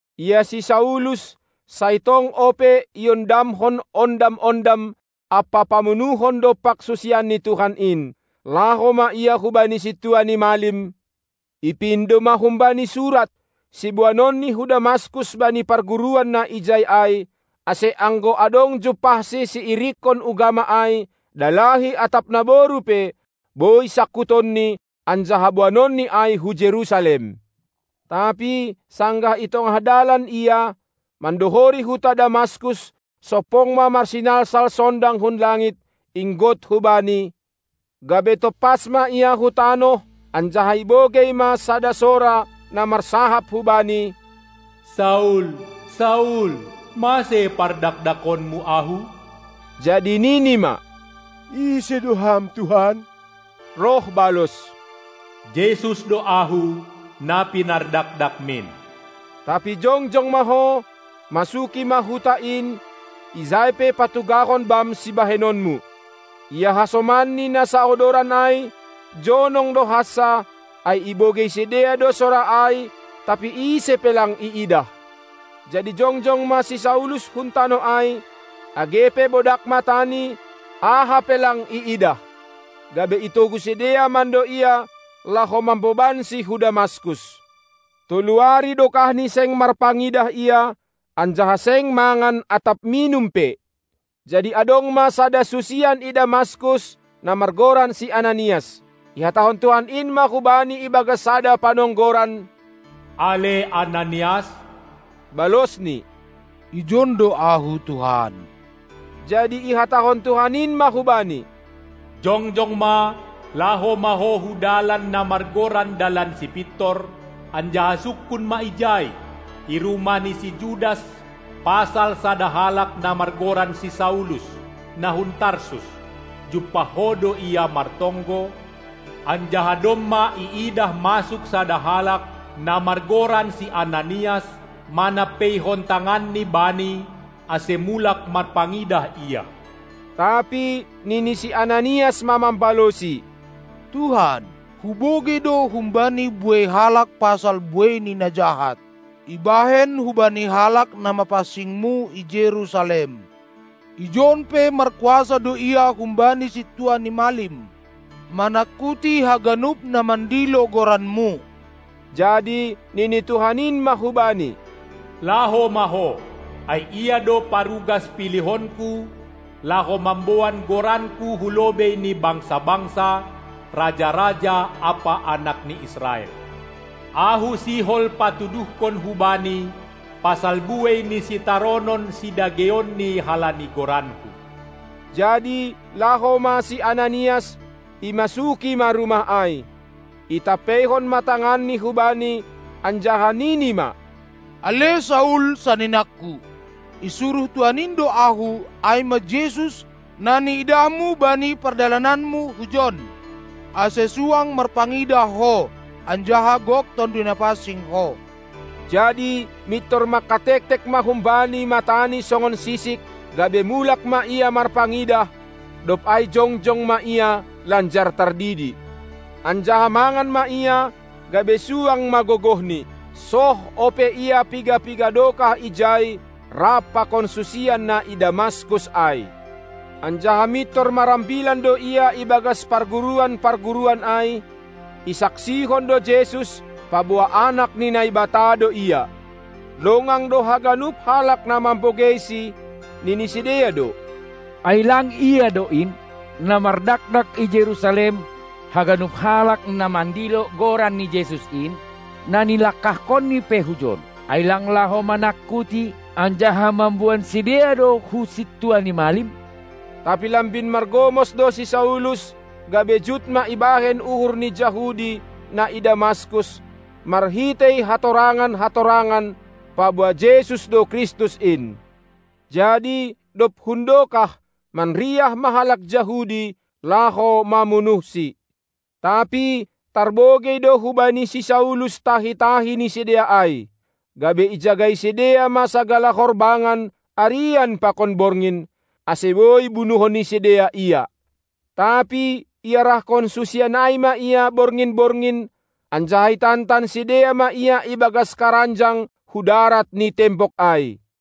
Ia si Saulus sai tong ope iondamhon ondam-ondam ampa pamunuhon dompak susian ni Tuhan in. Laho ma ia hubani sintua ni malim, ipindo ma humbani surat, siboanonni hu Damaskus bani parguruan na ijai ai, ase anggo adong jumpahsi siirikkon ugama ai, dalahi atap naboru pe, boi sangkutonni anjaha boanonni ai hu Jerusalem. Tapi sanggah i tongah dalan ia, mandohori huta Damaskus, sompong ma marsinalsal sondang hun langit, inggot hu bani, gabe tompas ma ia hu tanoh, anjaha ibogei ma sada sora, na marsahap hubani: Saul, Saul, mase pardakdakonmu Ahu? Jadi nini ma: Ise do Ham Tuhan? Roh balos: Jesus do Ahu, na pinardakdakmin. Tapi jongjong ma ho, masuki ma huta in, ijai pe patugahon bam sibahenonmu! Ia hasomanni na saodoran ai, jonong do hansa, ai ibogei sidea do sora ai, tapi ise pe lang iidah. Jadi jongjong ma si Saulus hun tanoh ai; age pe bodak matani, aha pe lang iidah. Gabe itogu sidea mando ia, laho mambobansi hu Damaskus. Tolu ari dokahni seng marpangidah ia, anjaha seng mangan atap minum pe. Jadi adong ma sada susian i Damaskus, na margoran si Ananias. Ihatahon Tuhan in ma hubani ibagas sada panonggoran: Ale Ananias! Balosni: Ijon do ahu, Tuhan! Jadi ihatahon Tuhan in ma hubani: Jongjong ma, laho ma ho hu dalan na margoran Dalan Sipintor, anjaha sungkun ma ijai, i rumah ni si Judas pasal sada halak na margoran si Saulus, na hun Tarsus. Jumpah ho do ia martonggo, anjaha domma iidah masuk sada halak, na margoran si Ananias, manampeihon tanganni bani, ase mulak marpangidah ia. Tapi nini si Ananias ma mambalosi: Tuhan, hubogei do humbani buei halak pasal buei ni na jahat, ibahen hubani halak na mapansing-Mu i Jerusalem. Ijon pe markuasa do ia humbani sintua ni malim, manangkuti haganup na mandilo goran-Mu. Jadi nini Tuhan in ma hubani: Laho ma ho, ai ia do parugas pilihonKu laho mamboan goranKu hu lobei ni bangsa-bangsa, raja-raja ampa anak ni Israel. Ahu sihol patuduhkon hubani pasal buei ni sitaronon sidageionni halani goranKu. Jadi laho ma si Ananias, imasuki ma rumah ai. Itampeihon ma tanganni hubani, anjaha nini ma: Ale Saul, saninangku, isuruh Tuhan in do ahu, ai ma Jesus, na niidahmu bani pardalananmu hujon, ase suang marpangidah ho, anjaha gok Tonduy Napansing ho. Jadi mintor mangkatektek ma humbani matani songon sisik, gabe mulak ma ia marpangidah; dob ai jongjong ma ia lanjar tardidi. Anjaha mangan ma ia, gabe suang ma gogohni. Soh ope ia piga-piga dokah ijai rap pakon susian na i Damaskus ai. Anjaha mintor marambilan do ia ibagas parguruan-parguruan ai, isaksihon do Jesus, paboa Anak ni Naibata do Ia. Longang do haganup halak na mambogeisi, nini sidea do: Ai lang ia do in, na mardakdak i Jerusalem haganup halak na mandilo Goran ni Jesus in? Na nilangkahkonni pe hujon, ai lang laho manangkuti anjaha mamboan sidea do hu sintua ni malim? Tapi lambin margomos do si Saulus, gabe jut ma ibaen uhur ni Jahudi, na i Damaskus, marhitei hatorangan-hatonangan, paboa Jesus do Kristus in. Jadi, dob hundokah, manriah ma halak Jahudi, laho mamunuhsi. Tapi tarbogei do hubani si Saulus tahi-tahi ni sidea ai. Gabe ijagai sidea ma sagala horbangan arian pakon borngin, ase boi bunuhon ni sidea ia. Tapi iarahkon susian ai ma ia borngin-borngin, anjaha itantan sidea ma ia i bagas karanjang hu darat ni tembok ai.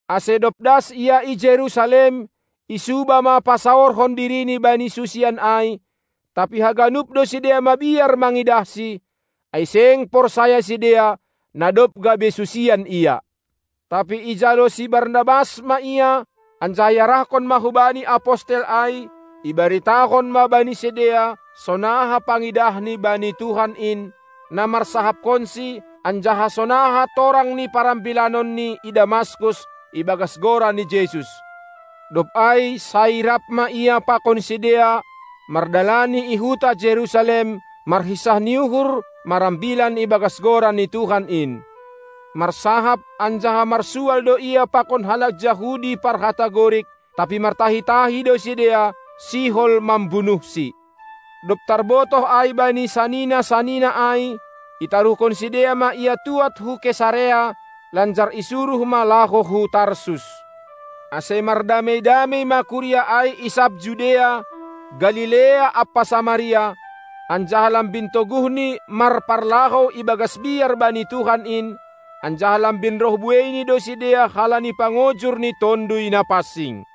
Ase dob das ia i Jerusalem, isuba ma pasaorhon dirini bani susian ai, tapi haganup do sidea mabiar mangidahsi, ai seng porsaya sidea, na dob gabe susian ia. Tapi ijalo si Barnabas ma ia, anjaha iarahkon ma hubani apostel ai; ibaritahon ma bani sidea sonaha pangidahni bani Tuhan in, na marsahapkonsi, anjaha sonaha torang ni parambilanonni i Damaskus ibagas Goran ni Jesus. Dob ai sai rap ma ia pakon sidea mardalani i huta Jerusalem, marhinsah ni uhur marambilan ibagas Goran ni Tuhan in. Marsahap anjaha marsual do ia pakon halak Jahudi parhata Gorik; tapi martahi-tahi do sidea, sihol mambunuhsi. Dob tarbotoh ai bani sanina-sanina ai, itaruhkon sidea ma ia tuad hu Kesarea, lanjar isuruh ma laho hu Tarsus. Ase mardamei-damei ma kuria ai i sab Judea, Galilea ampa Samaria, anjaha lambin toguhni marparlahou ibagas biar bani Tuhan in, anjaha lambin roh bueini do sidea halani pangojur ni Tonduy Napansing.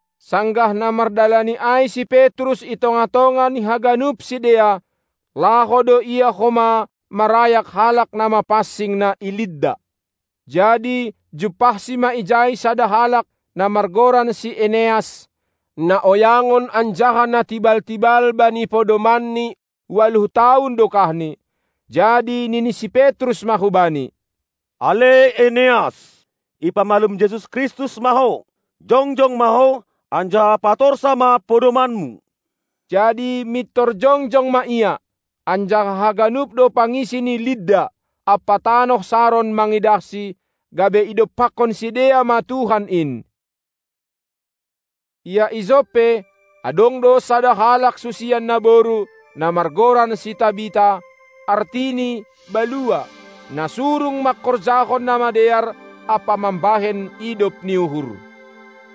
Sanggah na mardalani ai si Petrus i tongah-tongah ni haganup sidea, laho do ia homa marayak halak na mapansing na i Lidda. Jadi jumpahsi ma ijai sada halak, na margoran si Eneas, na oyangon anjaha na tibal-tibal bani podomanni ualuh tahun dokahni. Jadi nini si Petrus ma hubani: Ale Eneas, ipamalum Jesus Kristus ma ho! Jongjong ma ho, anjaha patorsa ma podomanmu! Jadi mintor jongjong ma ia. Anjaha haganup do pangisi ni Lidda ampa tanoh Saron mangidahsi, gabe idompakkon sidea ma Tuhan in. Ia i Joppe, adong do sada halak susian naboru, na margoran si Tabita, artini Balua, na surung mangkorjahon na madear ampa mambahen idop ni uhur.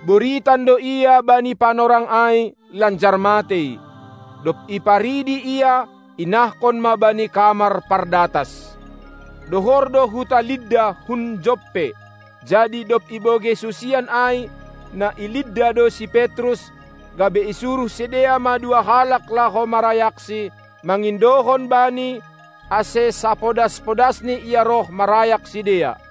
Boritan do ia bani panorang ai lanjar matei. Dob iparidi ia, inahkon ma bani kamar pardatas. Dohor do huta Lidda hun Joppe; jadi dob ibogei susian ai, na i Lidda do si Petrus, gabe isuruh sidea ma dua halak laho marayaksi, mangindohon bani, ase sapodas-podasni ia roh marayak sidea.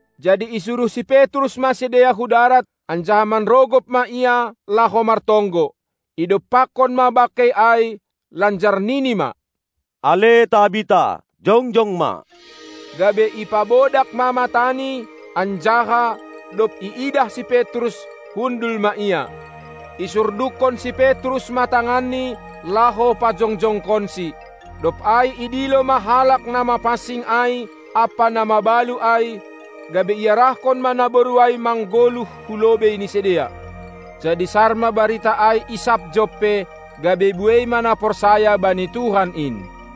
Jadi isuruh si Petrus ma sidea hu darat, anjaha manrogop ma ia laho martonggo. Idompakkon ma bangkei ai, lanjar nini ma: Ale Tabita, jongjong ma! Gabe ipabodak ma matani, anjaha, dob iidah si Petrus, hundul ma ia. Isurdukkon si Petrus ma tanganni, laho pajongjongkonsi. Dob ai idilo ma halak na mapansing ai ampa na mabalu ai, gabe iarahkon ma naboru ai manggoluh hu lobei ni sidea. Jadi sar ma barita ai i sab Joppe, gabe buei ma na porsaya bani Tuhan in.